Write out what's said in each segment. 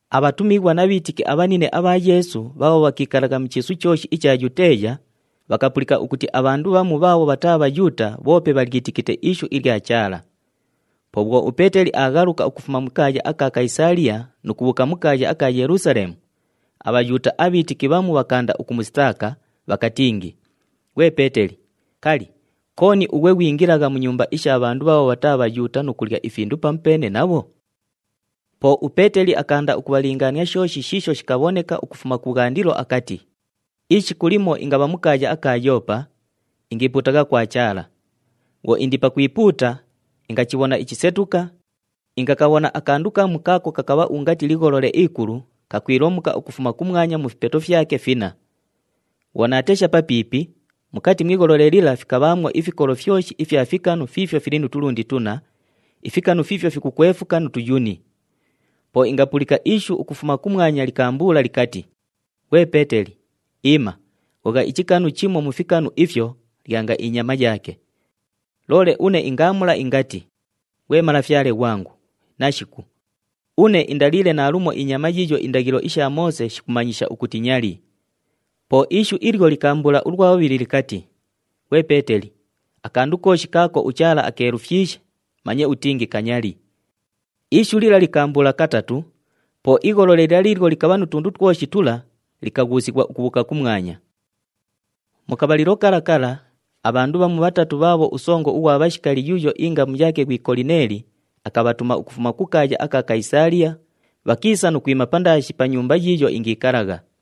Abhatumighwa na bhiitiki abhanine abha Yeesu bhaabho bhakiikalagha mu chiisu chooshi icha Yuteeya, bhakapulika ukuti abhandu bhamu bhaabho bhataa Bhayuuta bhoope bhalyitikite ishu ilya Chaala. Po bhwo uPeeteli aaghaluka ukufuma mu kaaya aka Kayisaaliya nu kubhuuka mu kaaya aka Yelusaleemu, aBhayuuta abhiitiki bhamu bhakaanda ukumusitaaka, bhakatingi, “Ghwe Peeteli, kali, kooni ughwe ghwingilagha mu nyumba isha bhandu bhaabho bhataa Bhayuuta nu kulya ifindu pamupeene nabho?” Po uPeeteli akaanda ukubhalingaania shooshi shiisho shikabhoneka ukufuma kubhwandilo akati, “Ishiku limo ingabha mu kaaya aka Yoopa, ingiipuutagha kwa Chaala. Bhwo indi pakwipuuta, ingachibhona ichisetuka, ingakabhona akandu kamu kaako kakabha ungati ligholole ikulu kakwilomuka ukufuma kumwanya mu fipeto fyake finna. Bhwo naatesha papiipi, mukati mu igholole lila fikabhaamwo ifikolo fyoshi ifya fikanu fiifyo fili nu tulundi tunna, ifikanu fiifyo fikukwefuka nu tuyuni. Po ingapulika ishu ukufuma kumwanya likaambuula likati, ‘Ghwe Peeteli, iima, ghogha ichikanu chimo mu fikanu ifyo, lyanga inyama yaake.’ Loole une ingaamula ingati, ‘Ghwe Malafyale ghwangu, nashiku! Une indaliile naalumo inyama yiiyo indaghilo isha Moose shikumanyisha ukuti nyali.’ Po ishu ilyo likaambuula ulwa bhubhili likati, ‘Ghwe Peeteli, akandu kooshi kaako uChaala akeelufyishe, manye utingi kanyali.’ Ishu lila likaambuula katatu, po igholole lila liilyo likabha nu tundu twoshi tula likaghuusighwa ukubhuuka kumwanya. “Mu kabhalilo kala kala, abhandu bhamu bhatatu bhaabho usongo ughwa bhashikali yuuyo ingamu yaake ghwi Kolineeli akabhatuma ukufuma ku kaaya aka Kayisaaliya, bhakiisa nu kwima pandaashi pa nyumba yiiyo ingiikalagha.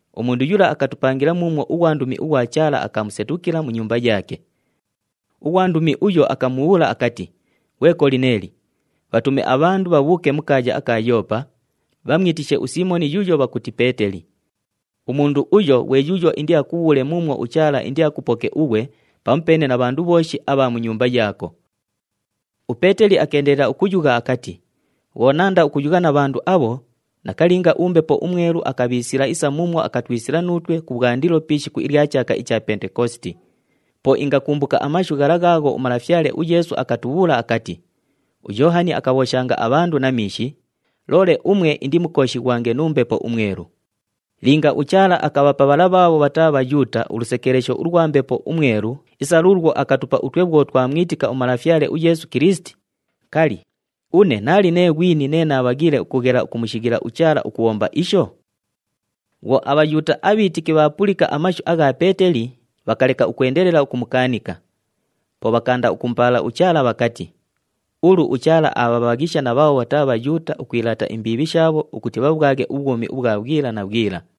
Umundu yula akatupangila muumwo ughwandumi ughwa Chaala akamusetukila mu nyumba yaake. Ughwandumi uyo akamubhuula akati, ‘Ghwe Kolineeli, bhatume abhandu bhabhuuke mu kaaya aka Yoopa, bhamwitishe uSiimoni yuuyo bhakuti Peeteli. Umundu uyo ghwe yuuyo indiakubhuule muumwo uChaala indiakupoke ughwe pamupeene na bhandu bhooshi abha mu nyumba yaako.’” UPeeteli akeendelela ukuyugha akati, “Bhwo naanda ukuyugha na bhandu abho, nakalinga uMbepo uMwelu akabhiisila isa muumwo akatwisila nuutwe kubhwandilo pi ishiku ilya chaaka icha Pentekositi. Po ingakumbuka amashu ghala ghaagho uMalafyale uYeesu akatubhuula akati, ‘UYoohani akabhooshanga abhandu na miishi, loole umwe indimukooshighwange nu Mbepo uMwelu.’ Linga uChaala akabhapa bhala bhaabho bhataa Bhayuuta ulusekeelesho ulwa Mbepo uMwelu isa luulwo akatupa utwe bhwo twamwitika uMalafyale uYeesu Kilisiti, kali, une naali nee ghwini nee naabhaghiile ukughela ukumushighila uChaala ukubhomba isho?” Bhwo aBhayuuta abhiitiki bhaapulika amashu agha Peeteli, bhakaleka ukwendelela ukumukaanika. Po bhakaanda ukumupaala uChaala bhakati, “Ulu uChaala aabhabhaghisha na bhaabho bhataa Bhayuuta ukwilaata imbiibhi shaabho ukuti bhabhwaghe ubhwumi ubhwa bhwila na bhwila.”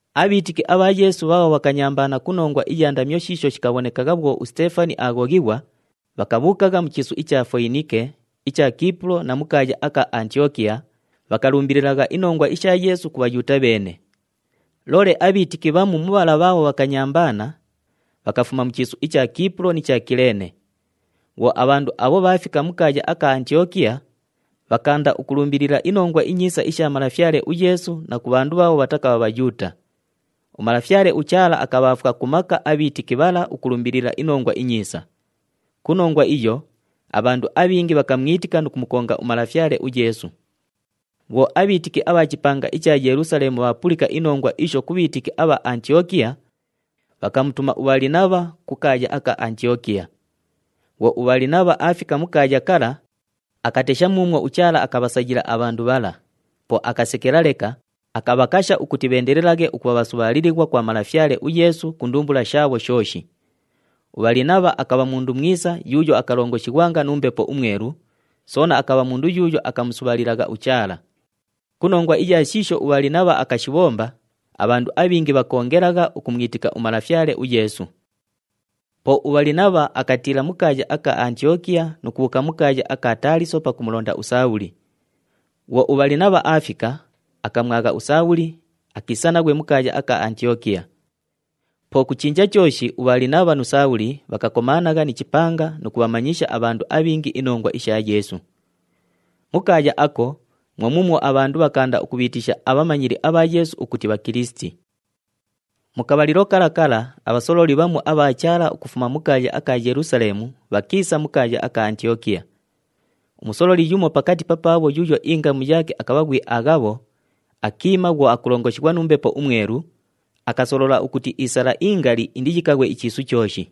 Abhiitiki abha Yeesu bhaabho bhakanyambaana ku nongwa iya ndamyo shiisho shikabhonekagha bhwo uSiteefani aaghoghighwa, bhakabhuukagha mu chiisu icha Foyinike, icha Kiipulo na mu kaaya aka Antiyokiya, bhakalumbililagha inongwa isha Yeesu ku Bhayuuta bheene. Loole abhiitiki bhamu mu bhala bhaabho bhakanyambaana, bhakafuma mu chiisu icha Kiipulo ni cha Kileene. Bhwo abhandu abho bhaafika mu kaaya aka Antiyokiya, bhakaanda ukulumbilila iNongwa iNyiisa isha Malafyale uYeesu na ku bhandu bhaabho bhatakabha Bhayuuta. UMalafyale uChaala akabhaafwa ku maka abhiitiki bhala ukulumbilila iNongwa iNyiisa. Ku nongwa iyo, abhandu abhingi bhakamwitika nu kumukonga uMalafyale uYeesu. Bhwo abhiitiki abha chipanga icha Yelusaleemu bhaapulika inongwa isho ku bhiitiki abha Antiyokiya, bhakamutuma uBhalinabha ku kaaya aka Antiyokiya. Bhwo uBhalinabha aafika mu kaaya kala, akatesha muumwo uChaala akabhasayila abhandu bhala. Po akasekela leka, akabhakasha ukuti bheendelelaghe ukubha bhasubhaalilighwa kwa Malafyale uYeesu ku ndumbula shaabho shooshi. UBhalinabha akabha mundu mwisa yuuyo akalongoshighwanga nu Mbepo uMwelu, soona akabha mundu yuuyo akamusubhaalilagha uChaala. Ku nongwa iya shiisho uBhalinabha akashibhomba, abhandu abhingi bhakoongelagha ukumwitika uMalafyale uYeesu. Po uBhalinabha akatiila mu kaaya aka Antiyokiya nu kubhuuka mu kaaya aka Taaliso pakumulonda uSaabhuli. Bhwo uBhalinabha aafika, akamwagha uSaabhuli, akiisa naghwe mu kaaya aka Antiyokiya. Po ku chinja chooshi uBhalinabha nu Saabhuli bhakakomaanagha ni chipanga nu kubhamanyisha abhandu abhingi inongwa isha Yeesu. Mu kaaya ako mwo muumwo abhandu bhakaanda ukubhiitisha abhamanyili abha Yeesu ukuti Bhakilisiti. Mu kabhalilo kala kala abhasololi bhamu abha Chaala ukufuma mu kaaya aka Yelusaleemu bhakiisa mu kaaya aka Antiyokiya. Umusololi yumo pakati papaabho yuuyo ingamu yaake akabha ghwi Aghabho, akiima bhwo akulongoshighwa nu Mbepo uMwelu, akasolola ukuti isala ingali indiyikaghwe ichiisu chooshi.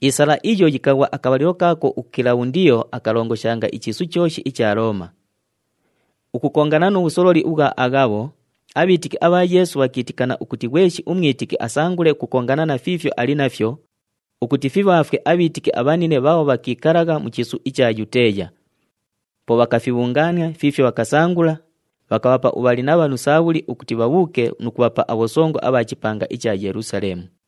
Isala iyo yikaghwa akabhalilo kaako uKilabhundiyo akalongoshanga ichiisu chooshi icha Looma. Ukukongana nu bhusololi ubhwa Aghabho, abhiitiki abha Yeesu bhakiitikana ukuti ghweshi umwitiki asangule ukukongana na fiifyo ali nafyo ukuti fibhaafwe abhiitiki abhanine bhaabho bhakiikalagha mu chiisu icha Yuteeya. Po bhakafibhungaania fiifyo bhakasangula, bhakabhapa uBhalinabha nu Saabhuli ukuti bhabhuuke nu kubhapa abhosongo abha chipanga icha Yelusaleemu.